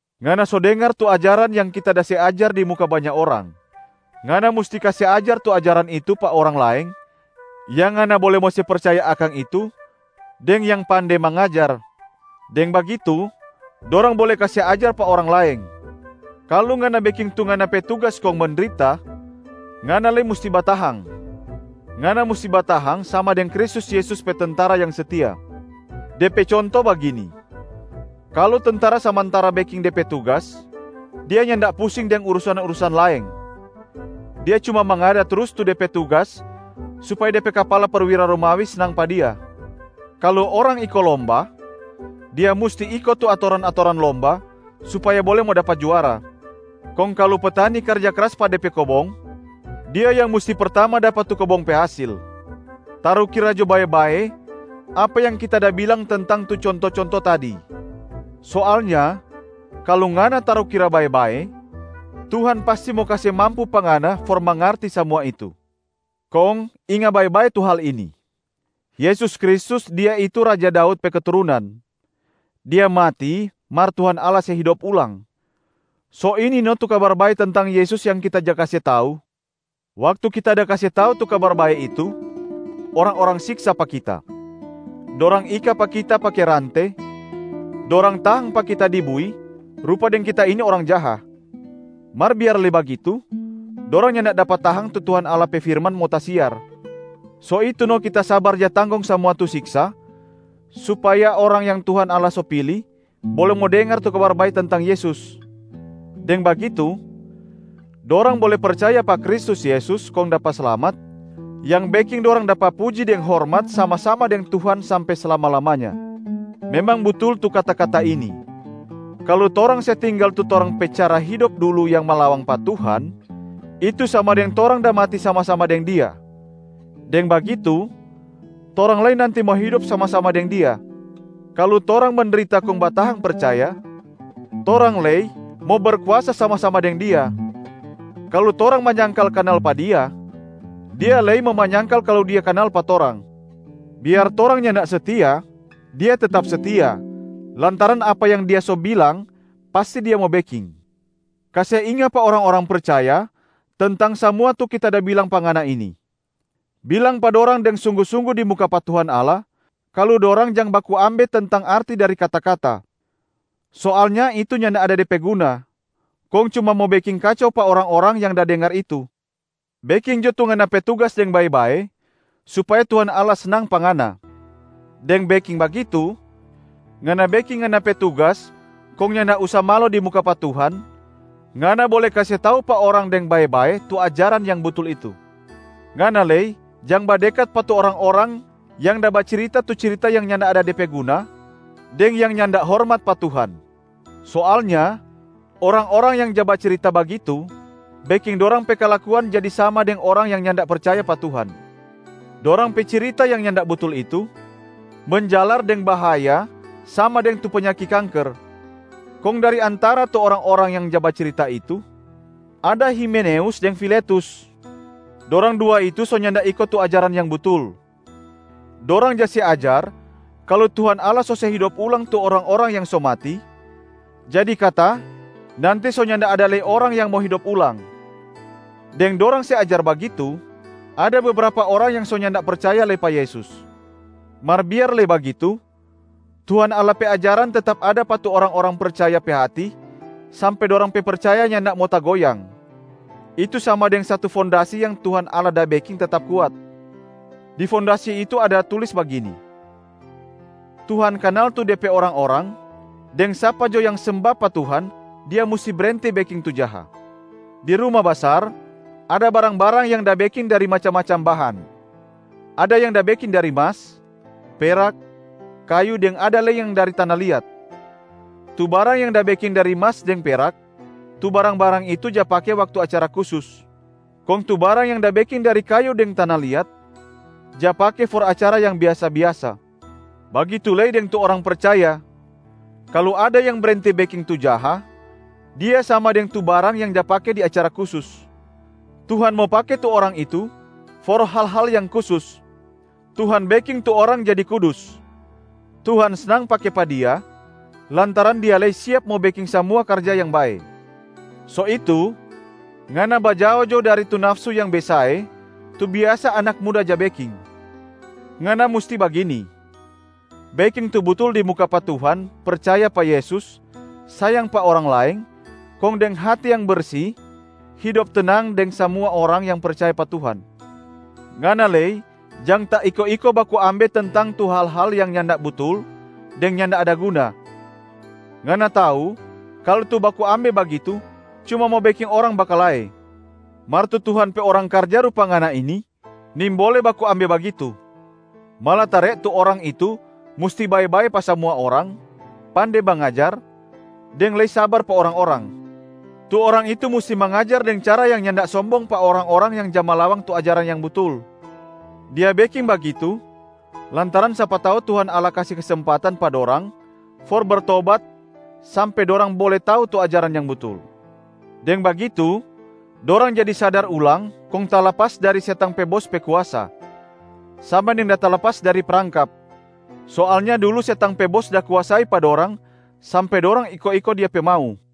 Ngana so dengar tu ajaran yang kita da se ajar di muka banya orang. Ngana musti kase ajar tu ajaran itu pa orang laeng yang ngana bole mo se percaya akang itu deng yang pande mangajar. Deng bagitu dorang bole kase ajar pa orang laeng. Kalu ngana beking tu ngana pe tugas kong mendrita, ngana lei musti batahang. Ngana musti batahang sama deng Kristus Yesus pe tentara yang setia. De pe conto bagini: kalu tentara samantara beking de pe tugas, dia nyanda pusing deng urusan-urusan laeng. Dia cuma mangada trus tu de pe tugas supaya de pe kapala perwira Romawi snang pa dia. Kalu orang iko lomba, dia musti iko tu atoran-atoran lomba supaya bole mo dapa juara. Kong kalu petani karja kras pa de pe kobong, dia yang musti pertama dapa tu kobong pe hasil. Tarukira jo bae-bae apa yang kita da bilang tentang tu conto-conto tadi! Soalnya kalu ngana tarukira bae-bae, Tuhan pasti mo kase mampu pa ngana for mangarti samua itu. Kong inga bae-bae tu hal ini: Yesus Kristus, Dia itu raja Daud pe keturunan. Dia mati mar Tuhan Allah se hidop ulang. So ini no tu Kabar Bae tentang Yesus yang kita ja kase tau. Waktu kita da kase tau tu Kabar Bae itu, orang-orang siksa pa kita. Dorang ika pa kita pake rante, dorang tahang pa kita di bui rupa deng kita ini orang jaha. Mar biar lei bagitu, dorang nyanda dapa tahang tu Tuhan Allah pe firman mo tasiar. So itu no kita sabar ja tanggong samua tu siksa, supaya orang yang Tuhan Allah so pili bole mo dengar tu Kabar Bae tentang Yesus. Deng bagitu dorang bole percaya pa Kristus Yesus kong dapa slamat yang beking dorang dapa puji deng hormat sama-sama deng Tuhan sampe slama-lamanya. Memang butul tu kata-kata ini, “Kalu torang se tinggal tu torang pe cara hidop dulu yang malawang pa Tuhan, itu sama deng torang da mati sama-sama deng Dia. Deng bagitu, torang lei nanti mo hidop sama-sama deng Dia. Kalu torang mendrita kong batahang percaya, torang lei mo berkuasa sama-sama deng Dia. Kalu torang manyangkal kanal pa Dia, Dia lei mo manyangkal kalu Dia kanal pa torang. Biar torang nyanda setia, Dia tetap setia, lantaran apa yang Dia so bilang pasti Dia mo beking.” Kase inga pa orang-orang percaya tentang samua tu kita da bilang pa ngana ini. Bilang pa dorang deng sunggu-sunggu di muka pa Tuhan Allah kalu dorang jang baku ambe tentang arti dari kata-kata. Soalnya itu nyanda ada de pe guna, kong cuma mo beking kacau pa orang-orang yang da dengar itu. Beking jo tu ngana pe tugas deng bae-bae supaya Tuhan Allah snang pa ngana. Deng beking bagitu, ngana beking ngana pe tugas kong nyanda usa malo di muka pa Tuhan, ngana bole kase tau pa orang deng bae-bae tu ajaran yang butul itu. Ngana lei jang badekat pa tu orang-orang yang da bacirita tu cirita yang nyanda ada de pe guna deng yang nyanda hormat pa Tuhan. Soalnya orang-orang yang ja bacirita bagitu beking dorang pe kalakuan jadi sama deng orang yang nyanda percaya pa Tuhan. Dorang pe cirita yang nyanda butul itu menjalar deng bahaya sama deng tu panyaki kanker. Kong dari antara tu orang-orang yang ja bacirita itu, ada Himeneus deng Filetus. Dorang dua itu so nyanda iko tu ajaran yang butul. Dorang ja se ajar kalu Tuhan Allah so se hidop ulang tu orang-orang yang so mati, jadi kata nanti so nyanda ada lei orang yang mo hidop ulang. Deng dorang se ajar bagitu, ada bebrapa orang yang so nyanda percaya lei pa Yesus. Mar biar lei bagitu, Tuhan Allah pe ajaran tetap ada pa tu orang-orang percaya pe hati sampe dorang pe percaya nyanda mo tagoyang, itu sama deng satu fondasi yang Tuhan Allah da beking tetap kuat. Di fondasi itu ada tulis bagini, “Tuhan kanal tu De pe orang-orang” deng “Sapa jo yang semba pa Tuhan, dia musti brenti beking tu jaha.” Di ruma basar, ada barang-barang yang da beking dari macam-macam bahan. Ada yang da beking dari mas, perak, kayu deng ada lei yang dari tana liat. Tu barang yang da beking dari mas deng perak, tu barang-barang itu ja pake waktu acara kusus. Kong tu barang yang da beking dari kayu deng tana liat, ja pake for acara yang biasa-biasa. Bagitu lei deng tu orang percaya. Kalu ada yang brenti beking tu jaha, dia sama deng tu barang yang ja pake di acara kusus. Tuhan mo pake tu orang itu for hal-hal yang kusus. Tuhan beking tu orang jadi kudus. Tuhan snang pake pa dia lantaran dia lei siap mo beking samua karja yang bae. So itu ngana bajao jo dari tu nafsu yang besae tu biasa anak muda ja beking. Ngana musti bagini: beking tu butul di muka pa Tuhan, percaya pa Yesus, sayang pa orang laeng, kong deng hati yang bersi hidop tenang deng samua orang yang percaya pa Tuhan. Ngana lei jang taiko-iko baku ambe tentang tu hal-hal yang nyanda butul deng nyanda ada guna. Ngana tau kalu tu baku ambe bagitu cuma mo beking orang bakalae. Mar tu Tuhan pe orang karja rupa ngana ini nimbole baku ambe bagitu. Malatare tu orang itu musti bae-bae pa samua orang, pande mangajar deng lei sabar pa orang-orang. Tu orang itu musti mangajar deng cara yang nyanda sombong pa orang-orang yang ja malawang tu ajaran yang butul. Dia beking bagitu lantaran sapa tau Tuhan Allah kase kesempatan pa dorang for bertobat sampe dorang bole tau tu ajaran yang butul. Deng bagitu, dorang jadi sadar ulang kong talapas dari setang pe bos pe kuasa, sama deng da talapas dari prangkap. Soalnya dulu setang pe bos da kuasai pa dorang sampe dorang iko-iko dia pe mau.